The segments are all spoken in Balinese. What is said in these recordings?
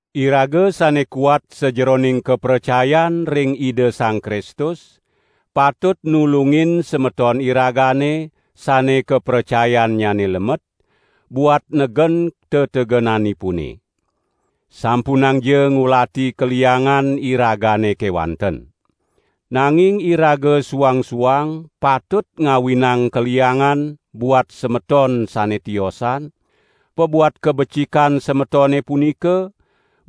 Iraga sane kuat sajeroning kapracayan ring Ida Sang Kristus, patut nulungin semeton iragane sane kapracayannyane lemet, buat negen tetegenanipune. Sampunangja ngulati kaliangan iragane kewanten. Nanging iraga suang-suang patut ngawinang kaliangan buat semeton sane tiosan, pabuat kabecikan semetone punika,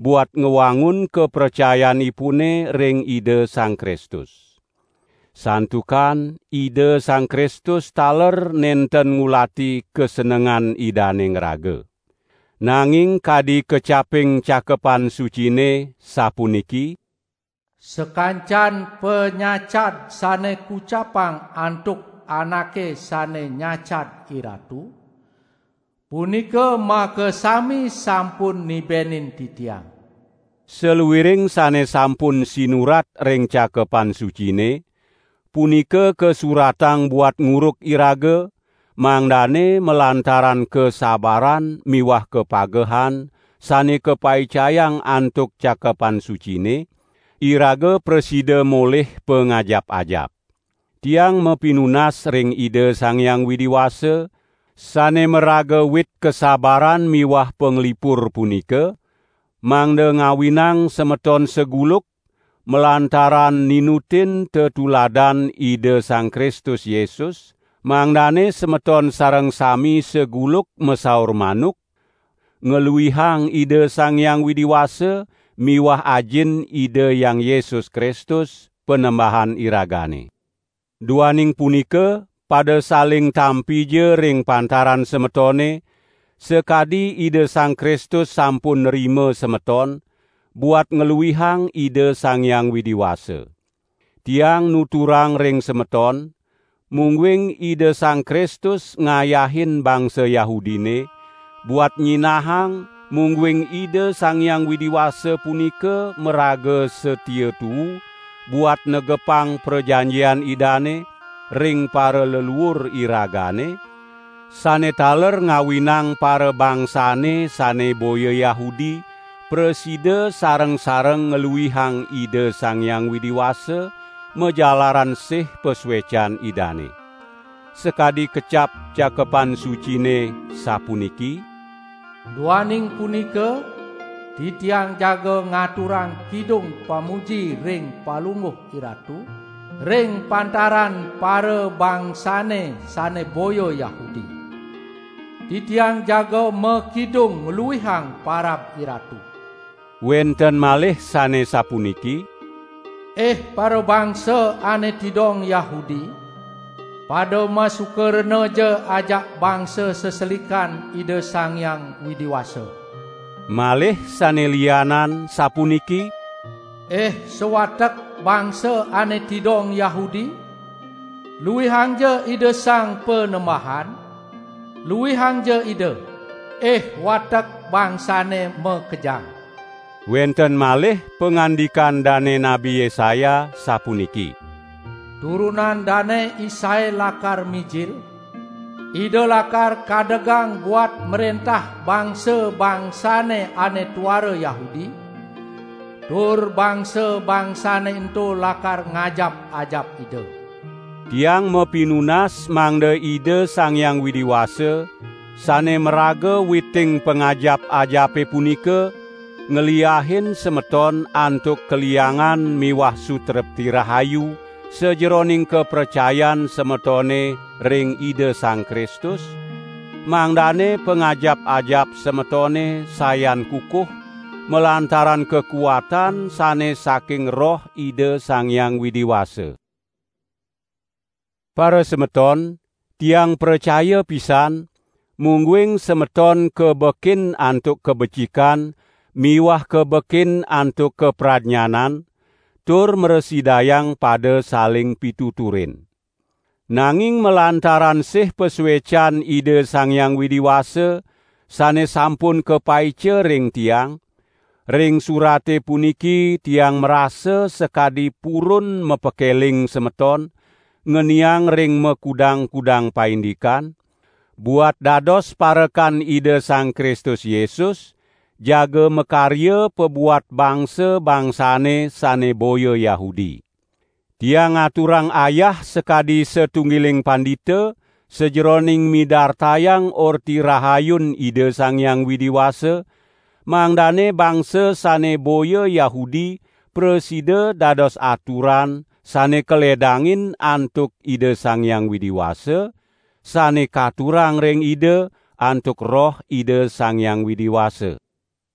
buat ngwangun kapracayanipune ring Ida Sang Kristus. Santukan Ida Sang Kristus taler nenten ngulati kasenengan Idane ngraga. Nanging kadi kecaping Cakepan Sucine, sapuniki: "Sakancan panyacad sane kucapang antuk anake sane nyacad IRatu, punika makasami sampun nibenin titiang." Saluiring sane sampun sinurat ring Cakepan Sucine, punika kasuratang buat nguruk iraga, mangdane malantaran kasabaran miwah kapagehan sane kapaicayang antuk Cakepan Sucine, iraga prasida molih pangajap-ajap. Tiang mapinunas ring Ida Sang Hyang Widi Wasa, sane maraga wit kasabaran miwah panglipur punika, mangda ngawinang semeton saguluk, malantaran ninutin tetuladan Ida Sang Kristus Yesus, mangdane semeton sareng sami saguluk masaur manuk ngluihang Ida Sang Hyang Widi Wasa miwah Ajin Ida Hyang Yesus Kristus, Panembahan iragane. Duaning punika, pada saling tampija ring pantaran semetone, sakadi Ida Sang Kristus sampun nrima semeton, buat ngluihang Ida Sang Hyang Widi Wasa. Tiang nuturang ring semeton, mungguing Ida Sang Kristus ngayahin bangsa Yahudine, buat nyinahang mungguing Ida Sang Hyang Widi Wasa punika maraga satia tuu buat negepang prajanjian Idane, ring paraleluur iragane, sane taler ngawinang parabangsane sane boya Yahudi prasida sareng-sareng ngluihang Ida Sang Hyang Widi Wasa majalaran sih pasuecan Idane. Sakadi kecap Cakepan Sucine, sapuniki: "Duaning punika titiang jaga ngaturang kidung pamuji ring Palungguh IRatu ring pantaran parabangsane sane boya Yahudi. Titiang jaga makidung ngluihang parab IRatu." Wenten malih sane sapuniki: "Ih parabangsa ane tidong Yahudi, pada masuka renaja ajak bangsa seselikan Ida Sang Hyang Widi Wasa." Malih sane lianan sapuniki: "Ih sawatek bangsa ane tidong Yahudi, luihangja Ida Sang Panembahan; luihangja Ida, ih watek bangsane makejang." Wenten malih pangandikan dane Nabi Yesaya, sapuniki: "Turunan Dane Isai lakar mijil; Ida lakar kadegang buat mrentah bangsa-bangsane ane tuara Yahudi, tur bangsa-bangsane ento lakar ngajap-ajap Ida." Tiang mapinunas mangda Ida Sang Hyang Widi Wasa, sane maraga witing pangajap-ajape punika, ngliahin semeton antuk kaliangan miwah sutrepti rahayu sajeroning kapracayan semetone ring Ida Sang Kristus, mangdane pangajap-ajap semetone sayan kukuh, malantaran kakuatan sane saking Roh Ida Sang Hyang Widi Wasa. Parasemeton, tiang pracaya pisan, mungguing semeton kabekin antuk kabecikan miwah kabekin antuk kapradnyanan, tur mrasidayang pada saling pituturin. Nanging malantaran sih pasuecan Ida Sang Hyang Widi Wasa sane sampun kapaica ring tiang, ring surate puniki tiang marasa sakadi purun mapakeling semeton, ngeniang ring makudang-kudang paindikan, buat dados parekan Ida Sang Kristus Yesus jaga makarya pabuat bangsa-bangsane sane boya Yahudi. Tiang ngaturang ayah sakadi satunggiling pandita sajeroning midartayang Orti Rahayun Ida Sang Hyang Widi Wasa, mangdane bangsa sane boya Yahudi prasida dados aturan sane kaledangin antuk Ida Sang Hyang Widi Wasa, sane katurang ring Ida, antuk Roh Ida Sang Hyang Widi Wasa.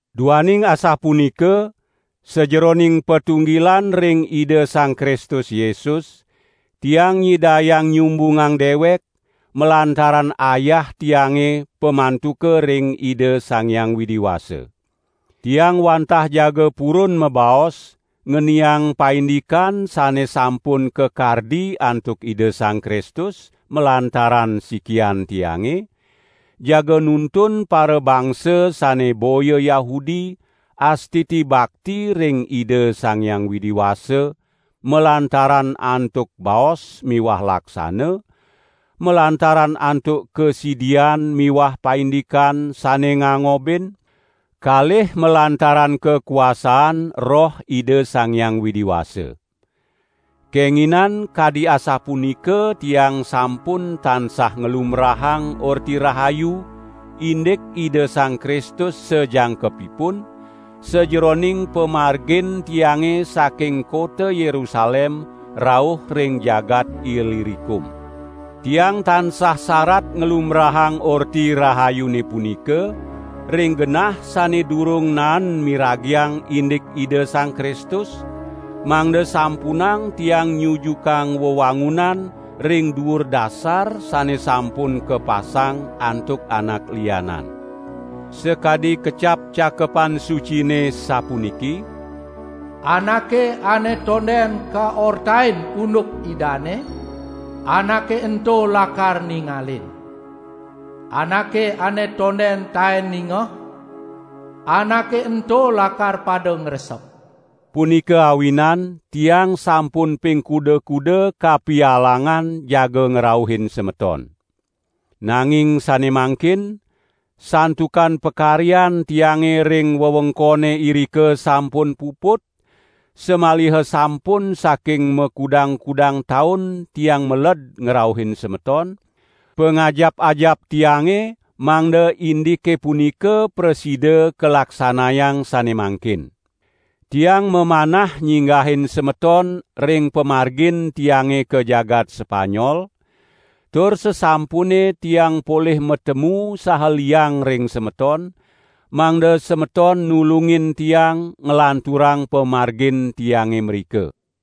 Duaning asapunika, sajeroning patunggilan ring Ida Sang Kristus Yesus, tiang nyidayang nyumbungan dewek, malantaran ayah tiange pamantuka ring Ida Sang Hyang Widi Wasa. Tiang wantah jaga purun mabaos ngeniang paindikan sane sampun kakardi antuk Ida Sang Kristus malantaran sikian tiange, jaga nuntun parabangsa sane boya Yahudi astiti bakti ring Ida Sang Hyang Widi Wasa, malantaran antuk baos miwah laksana, malantaran antuk kasidian miwah paindikan sane ngangobin, kalih malantaran kakuasaan Roh Ida Sang Hyang Widi Wasa. Kenginan kadi asapunika tiang sampun tansah nglumbrahang Orti Rahayu indik Ida Sang Kristus sajangkepipun, sajeroning pamargin tiange saking kota Yerusalem rauh ring jagat Ilirikum. Tiang tansah sarat nglumbrahang Orti Rahayune punika ring genah sane durung naen miragiang indik Ida Sang Kristus, mangda sampunang tiang nyujukang wewangunan ring duur dasar sane sampun kapasang antuk anak lianan. Sakadi kecap Cakepan Sucine sapuniki: "Anake ane tonden kaortain unduk Idane, anake ento lakar ningalin. Anake ane tonden taen ningeh, anake ento lakar pada ngresep." Punika awinan tiang sampun ping kuda-kuda kapialangan jaga ngrauhin semeton. Nanging sane mangkin, santukan pakaryan tiange ring wewengkone irika sampun puput, samaliha sampun saking makudang-kudang taun tiang meled ngrauhin semeton, pangajap-ajap tiange mangda indike punika prasida kalaksanayang sane mangkin. Tiang mamanah nyinggahin semeton ring pamargin tiange ka jagat Sepanyol, tur sasampune tiang polih matemu saha liang ring semeton, mangda semeton nulungin tiang nglanturang pamargin tiange mrika.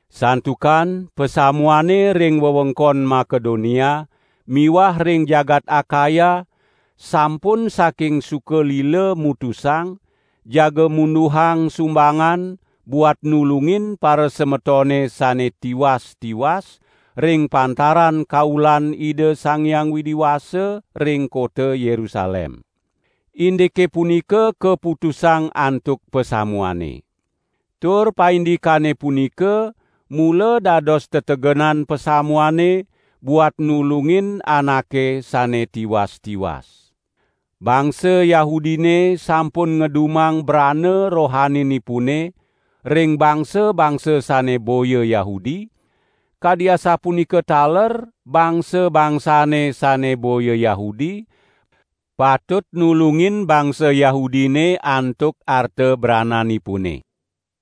Santukan pasamuane ring wewengkon Makedonia miwah ring jagat Akaya sampun saking suka lila mutusang jaga munduhang sumbangan buat nulungin parasemetone sane tiwas-tiwas ring pantaran kaulan Ida Sang Hyang Widi Wasa ring kota Yerusalem. Indike punika kaputusang antuk pasamuane. Tur paindikane punika mula dados tetegenan pasamuane buat nulungin anake sane tiwas-tiwas. Bangsa Yahudine sampun ngedumang brana rohaninipune ring bangsa-bangsa sane boya Yahudi, kadi asapunika taler bangsa-bangsane sane boya Yahudi patut nulungin bangsa Yahudine antuk arta brananipune.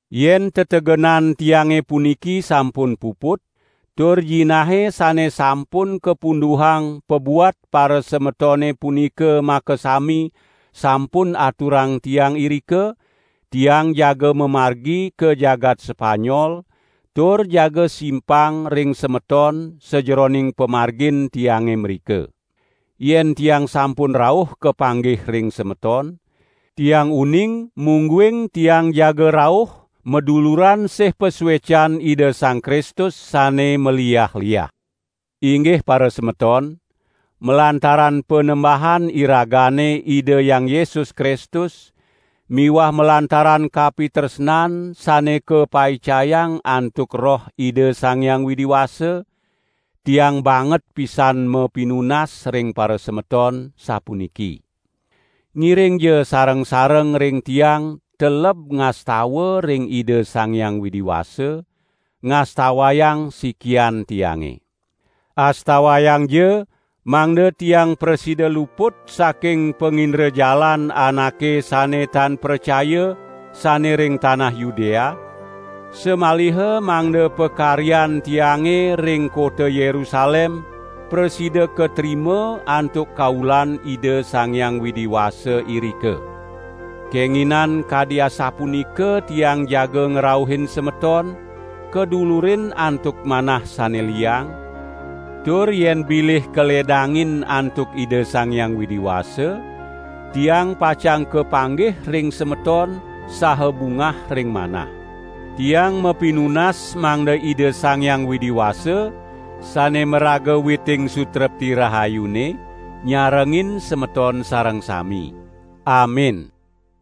Yen tetegenan tiange puniki sampun puput, tur jinahe sane sampun kapunduhang pabuat parasemetone punika makasami sampun aturang tiang irika, tiang jaga mamargi ka jagat Sepanyol tur jaga simpang ring semeton sajeroning pamargin tiange mrika. Yen tiang sampun rauh kapanggih ring semeton, tiang uning mungguing tiang jaga rauh maduluran sih pasuecan Ida Sang Kristus sane maliah-liah. Inggih parasemeton, malantaran Panembahan iragane Ida Hyang Yesus Kristus miwah malantaran kapitresnan sane kapaicayang antuk Roh Ida Sang Hyang Widi Wasa, tiang banget pisan mapinunas ring parasemeton sapuniki: Ngiringja sareng-sareng ring tiang teleb ngastawa ring Ida Sang Hyang Widi Wasa, ngastawayang sikian tiange. Astawayangja mangda tiang prasida luput saking pangindrajalan anake sane tan pracaya sane ring tanah Yudea, samaliha mangda pakaryan tiange ring kota Yerusalem prasida katrima antuk kaulan Ida Sang Hyang Widi Wasa irika. Kenginan kadi asapunika tiang jaga ngrauhin semeton kadulurin antuk manah sane liang, tur yen bilih kaledangin antuk Ida Sang Hyang Widi Wasa, tiang pacang kapanggih ring semeton saha bungah ring manah. Tiang mapinunas mangda Ida Sang Hyang Widi Wasa, sane maraga witing sutrepti rahayune, nyarengin semeton sareng sami. Amin.